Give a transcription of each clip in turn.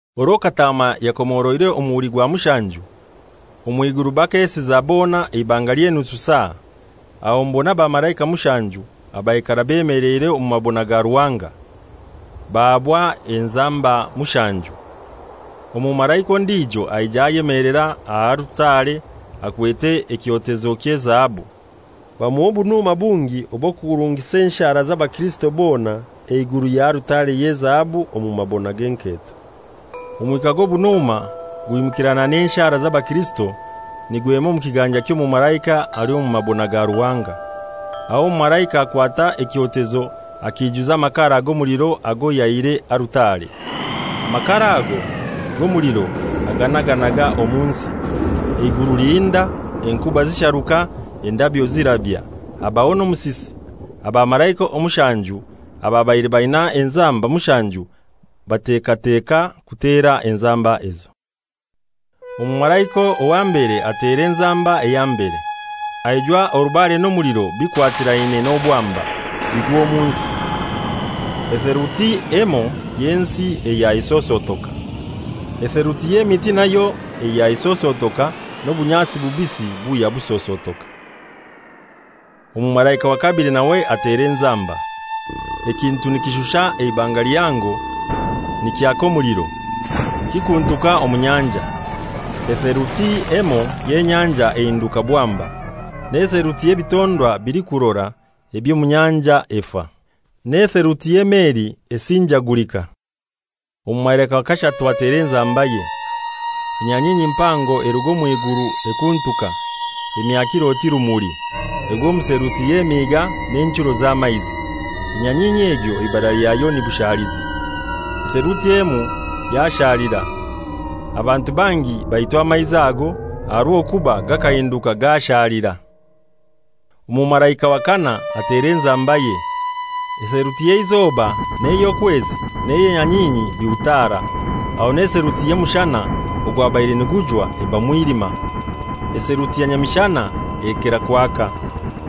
Orwo Kataama yakomoroire omuhuri gwa mushanju, omw'iguru bakesiza bona eibanga ly'enusu saa. Aho mbona abamalaika mushanju abaikara bemeleire omu mabona ga Ruhanga, bahaabwa enzamba mushanju. Omumalaika ondijo aija ayemelera aha alutare akwete ekyotezo ky'ezahabu. Bamuha obunuma bungi obw'okurungisa enshara z'abakirisito bona eiguru ya altare y'ezahabu omu mabona g'enketo. Omwika gw'obunuma gwimukirana n'enshara z'abakirisito nigwema omu kiganja ky'omumalaika ali omu mabona ga Ruhanga. Aho omumalaika akwata ekyotezo akiijuza amakara g'omuliro ago yaihire alutare, amakara ago g'omuliro aganaga omu nsi. Eiguru lihinda, enkuba zisharuka, endabyo zirabya, habaho n'omusisi. Abamalaika omushanju ababaire baina enzamba mushanju betekateka kutera enzamba ezo. Omumalaika owa mbere atera enzamba eya mbere, aijwa orubare n'omuliro bikwatiraine n'obwamba, bigwa omu nsi. Etheluti emoi y'ensi ehya esosotoka. Etheluti yemiti nayo ehya esosotoka, n'obunyasi bubisi buhya busosotoka. Omumalaika wa kabili nawe atera enzamba. Ekintu nikishusha eibanga lihango, nikyaka omuliro, kikuntuka omu nyanja. Etheluti emoi y'enyanja ehinduka bwamba, n'etheluti y'ebitondwa bilikurora eby'omu nyanja efa, n'etheluti y'emeli esinjagulika. Omumalaika wa kashatu atera enzambaye. Enyanyinyi mpango eruga omw'iguru ekuntuka. Emyakire oti rumuli, egwa omu theluthi y'emiiga n'enchuro z'amaizi. Enyanyinyi egyo eibara lyayo ni Bushalizi. Etheluti emoi y'ashalira, Abantu bangi baitwa amaizi ago, aha rw'okuba gakahinduka gashaalira. Omumalaika wa kanai atera enzambaye. Etheluti y'eizoba, n'ey'okwezi, n'ey'enyanyinyi bihutara, aho n'etheluti y'omushana (ogwabaire nigujwa) eba mwilima. Etheluti ya nyemishana elekera kwaka,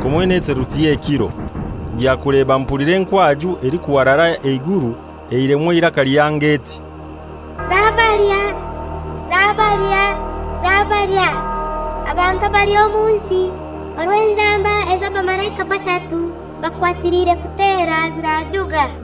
kumoi n'etheluti y'ekiro. Kugya kuleba mpulira enkwaju elikuharara eiguru eihiremu eiraka lihango eti, «Zabalya, zabalya, zabalya abantu abali omu nsi, orwo enzamba ezo abamalaika bashatu bakwatiliire kutera zirajuga!»